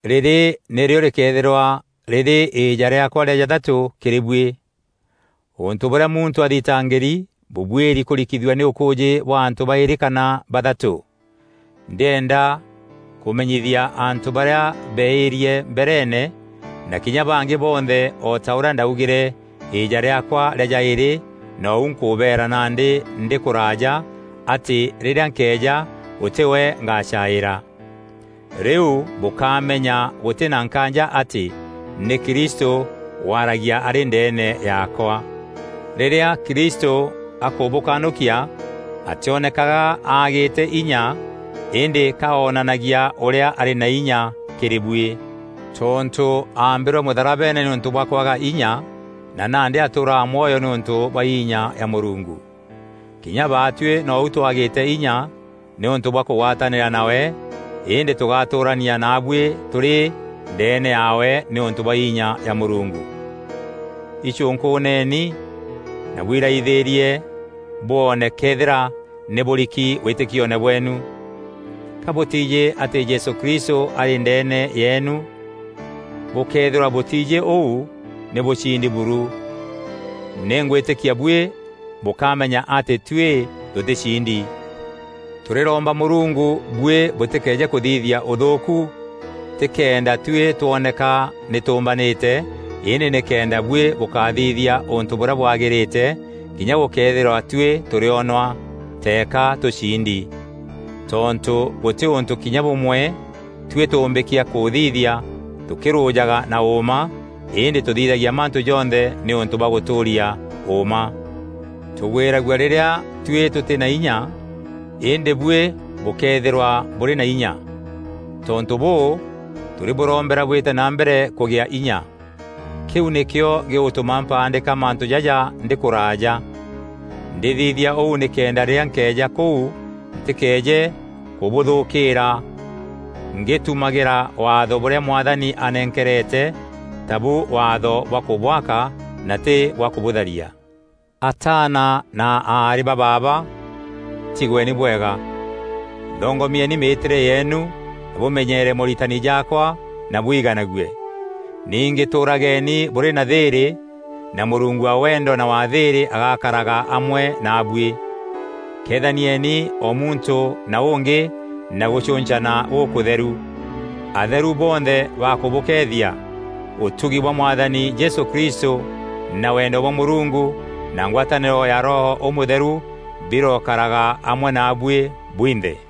Rîrî nîrîo rîkeethîrwa rîrî îîja rîaakwa rîa jathatû kîrî buî. Ûntû bûrîa muntû athitangîri bûbuîri kûrikithua nî ûkûûjî bwa antû baîrî kana bathatû. Ndîenda kûmenyithia antû barîa beeîrie mbereene, na kinya bangî bonthe, o ta ûrîa ndaugîre îîja rîaakwa rîa jaîrî nou nkûbeera nandî ndî kûraaja, atî rîrîa nkeeja gûtî we ngacaîîra. Rîu bûkamenya gûtî na nkaanja atî nî Kristû waragia arî ndeene yaakwa. Rîrîa Kristû akûbûkanûkia, atîonekaga aagîte inya îndî ka onanagia ûrîa arî na inya kîrî buî. Tontû aambîrwe mûtharabeene nîûntû bwa kwaga inya na nandî atûûraga mwoyo nîûntû bwa inya ya Mûrungu. Kinya baatuî nou twagîte inya nîûntû bwa kûgwatanîra nawe, îndî tûgatûûrania naabuî tûrî ndeene yaawe nîûntû bwa inya ya Mûrungu. Icûnkûûneni na bwiraiithîrie bwoone këethîra nî bûriki wîtîkione bweenu. Ka bûtiijî atî Jesû Kristû arî ndeene yeenu? Bûkëethîrwa bûtiijî ûu, nî bûciindi buru. Nî ngwîtîkia buî bûkamenya atî tuî tûtîciindi. Tûrîromba Mûrungu buî bûtîkeeje kûthithia ûthûûku; tî kenda tuî twoneka nî tûûmbanîte, îndî nîkenda buî bûkathithia ûntû bûrîa bwagîrîte, kinya gûkëethîrwa tuî tûrîonwa teeka tûciindi. Tontû gûtî ûntû kinya bûmwe tuî tûûmbîkia kûthithia tûkîrûjaga na ûûma, îndî tûthithagia mantû jonthe nîûntû bwa gûtûûria ûûma. Tûgwîragua rîrîa tuî tûtî na inya îndî buî bûkeethîrwa bûrî na inya. Tontû bûû, tûrîbûrombera bwîte na mbere kûgîa inya. Kîu nîkîo gîgûtûma mpaandîka mantû jaja ndî kûraaja. Ndîthithia ûu nîkenda rîrîa nkeeja kûu ntîkeeje kûbûthûkîîra ngîtumagîra Waatho bûrîa Mwathani anenkerete tabu waatho bwa kûbwaka na tî bwa kûbûtharia. Ataana na aarî ba baaba, tigweni bwega. Thongomieni mîîtîre yeenu na bûmenyeere mooritani jaakwa na bwiganague. Ningî tûûrageni bûrî na thîîrî, na Mûrungu wa wendo na wa thîîrî agakaraga amwe naabuî. Kethanieni o muntû na ûngî na gûcûncana gûkûtheru. Atheru bonthe bakûbûkeethia. Ûtugi bwa Mwathani Jesû Kristû na wendo bwa Mûrungu na ngwatanîro ya Roho Ûmûtheru birokaraga amwe naabuî bwinthe.